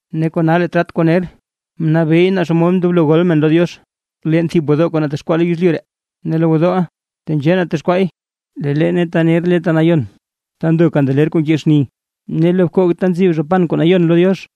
Ne kona lee trat kuu ner, mnabeey naa xomod ndoblo gol men lo Diox, leen thib gwodoo kuu natexkwaa lo yezlyu ree. Ne lee gwodooʼa tenzhee natexkwaay; lee leene ta ner le Ta Nayon, ta ndo kandeler kuu nke xni, ne lo bkoog ta ntsib zha pan kuu nayon lo Diox.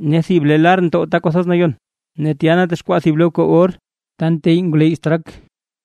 Ne thib le lar ntow Ta Kwathoz Nayon; ne tya natexkwaa thib bkoog or, ta nteyy ngwleyy straak,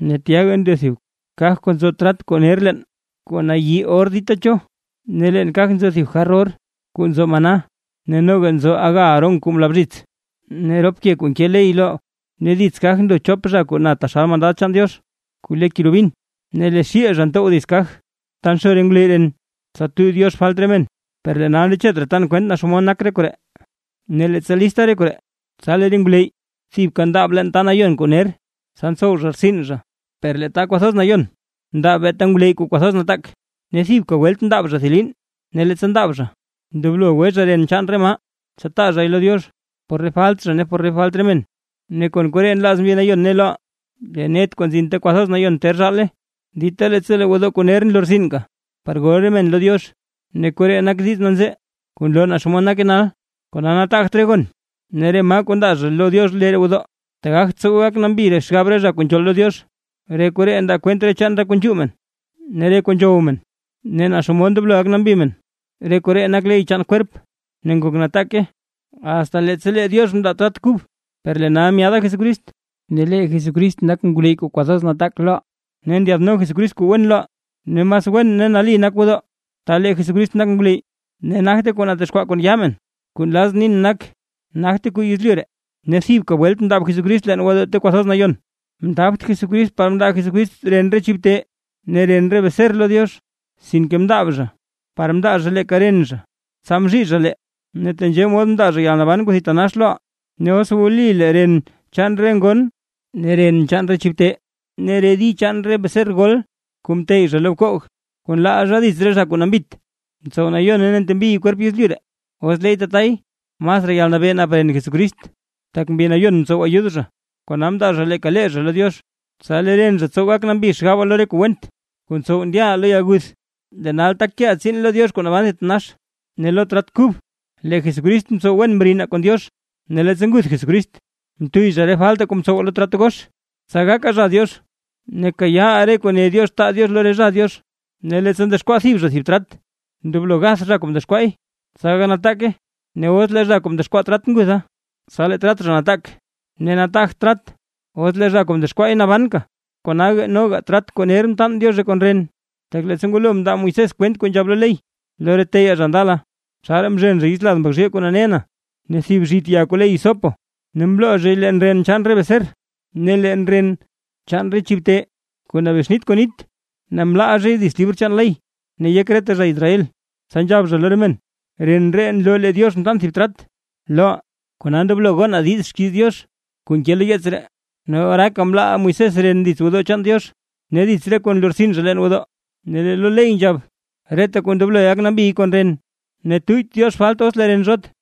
ne tyaga ndo thib kaj kuu nzo trat kuu ner leen kuu nayi kon or dita cho. Ne leen kaja nzo thib jar or kuu nzo maná ne noga aga Aarón kuu mla bzhits, ne rop ke kuu nke ley lo. Ne dits kaj ndo chop zha kuu na taxal mandad chaan Diox, kuu le kerubin; ne lee xiil zha ntow dits kaj ta nxo re ngwleyy ren tsa tuyy Diox falt re men. Per lee nal ndechet raa tan kwent naa xomod nak re koree. Ne, leettsa lista re koree, tsa lee re ngwleyy thibka ndaab leen ta nayon kuu ner, tsa tsow zha rtsin zha. Per lee Ta Kwathoz Nayon, ndaab beeta ngwleyy kuu kwathoz nataak, ne thibka welt ndaab zha thib liin; ne leettsa ndaab zha, ndoblo gwe zha ren chaan re maa, tsa taa zhay lo Diox, por re falt zha ne por re falt re men. Ne kon koree nlaaz Mbi Nayon ne loʼaa: Lee net kuu nzin Ta Kwathoz Nayon ter zhaale, dita leettsa lee gwodoo kuu ner nlortsinka par gol re men lo Diox. Ne koree nak diiz nanzee kuu nloo naa xomod nake nal. Kona nataagt re gon ne re maa kuu ndaa zha lo Diox lee roo gwodoo, tak gagt tsowe gak nambi xgab re zha kuu nzhool lo Diox. Re koree ndaa kwent chaan re kuu nzhuu men ne re kuu nzhow men, ne naa xomod ndoblo gak nambi men, re koree nak re ley chaan kwerp ne ngok nataake, asta leettsa lee Diox mndaa trat kub. Per lee nal myaada Jesucrist, ne lee Jesucrist nak ngwleyy kuu kwathoz nataak loʼaa, ne ndyaadno Jesucrist kuu wen loʼaa. Ne mas wen ne nali nak gwodoo ta lee Jesucrist nak ngwleyy, ne nagte kuu natexkwaa kon yaa men; kuu nlazʼn nin nak, nagte kuu yezlyu ree. Ne thibka welt mndaab Jesucrist leen gwodoo Ta Kwathoz Nayon, mndaabt Jesucrist par mndaa Jesucrist ren re chib te ne ren re beser lo Diox, sinke mndaab zha par mndaa zha leeka ren zha, tsa mzhii zha lee, ne tenzhee mod mndaa zha yalnaban kuu thitanax loʼaa. Ne os wli lee ren chaan re ngon ne ren chaan re chib te, ne re di chaan re beser gol kuu nteyy zha lo bkoog, kuu nlaal zha dits re zha kuu nambit, tsow nayone ne ntembiy kwerp yezlyu ree. Os leey tatay, ¡masraa yalnabee nap ren Jesucrist! Tak Mbi Nayon mtsow ayud zha, kona mndaa zha leeka lee zha lo Diox, tsa lee ren zha tsow gak nambi xgabaa lo re kuu went, kuu ntsow ndyaʼaa lo yalguth, lee nal tak keʼaa tsiin lo Diox kuu naban thitanax. Ne lo trat kub lee Jesucrist mtsow wen mrinaa kon Diox: Ne leettsa nguth Jesucrist mtuyy zha re faltaa kuu mtsowaa lo trat gox, tsa gakaa zha Diox ne kayaa lee re kuu ne Diox taa Diox lo re zha Diox. Ne leettsa ndexkwaa thib zha thib trat, ndoblo gath zha kuu mdexkwaay, tsa gak nataake. Ne os lee zha kuu mdexkwaa trat ngutha, tsa lee trat zha nataak, ne nataagt trat os le zha kuu mdexkwaay nabanka. Kona noga trat kuu ner mtaan Diozhe kon ren. Tak leettsa ngwalo mndaa Moisés kwent kuu nzhab lo ley lo re teyaa zha ndala: Tsaraa mzhen zha yits lad mbak zhiil kuu nane na, ne thib zhit ya kuu le hisopo, ne mloo zhay leen ren chaan re beser ne leen ren chaan re chib te kuu nabexnit kon nit, ne mlaal zhay dits libr chaan ley ne yek reta zha Israel. Tsa nzhab zha lo re men: “Ren ree nloo lee Diox mtaan thib trat loʼaa, kona ndoblo gonaa diiz xkiiz Diox kuu nke lo yeets ree”. [Ex.24:8] Ne oraaka mlaal Moisés ren dits gwodoo chaan Diox, ne dits re kuu nlortsin zha leen gwodoo. Ne lee lo ley nzhab: Reta kuu ndoblo gak nambiy kon ren; ne tuyyt Diox falt os lee ren zhot.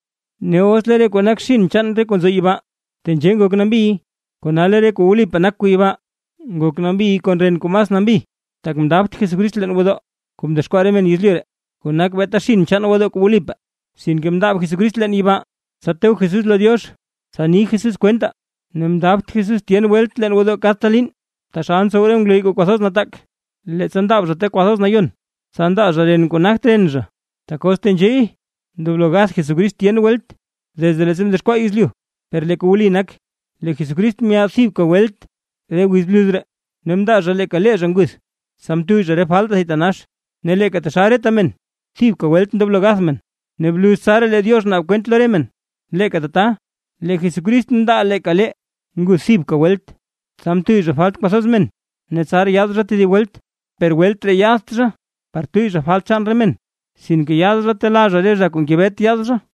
Ne os lee re kuu nak xinn chaan re kuu nzo yibaa tenzhee ngok nambiy, kona lee re kuu wlipaa nak kuu yibaa ngok nambiy kon ren kuu mas nambi. Tak mndaabt Jesucrist leen gwodoo kuu mdexkwaa re men yezlyu ree, kuu nak beeta xinn chaan gwodoo kuu wlipaa; sinke mndaab Jesucrist leen yibaa, tsa to Jesús lo Diox, tsa ni Jesús kwentaa. Ne mndaabt Jesús tyen welt leen gwodoo kadta liin, taxal ntsow re ngwleyy kuu kwathoz nataak, leettsa ndaab zha Ta Kwathoz Nayon, tsa ndaa zha ren kuu nagt ren zha. Tak os tenzheey, ndoblo gagath Jesucrist tyen welt desde leettsa mdexkwaa yezlyu. Per lee kuu wli nak, lee Jesucrist myaad thibka welt re wiz bluz ree, ne mndaa zha leeka lee zha nguth, tsa mtuyy zha re faltaa thitanax. Ne leeka taxal reta men thibka welt ndoblo gath men, ne bluz tsaraa lee Diox naab kwent lo re men, leeka tata, lee Jesucrist mndaa leeka lee, nguth thibka welt, tsa mtuyy zha falt kwathoz men. Ne tsaraa yaad zha tedib welt, per welt ree yaadt zha, par tuyy zha falt chaan re men, sinke yaad zha telaa zha re zha kuu ngebet yaad zha.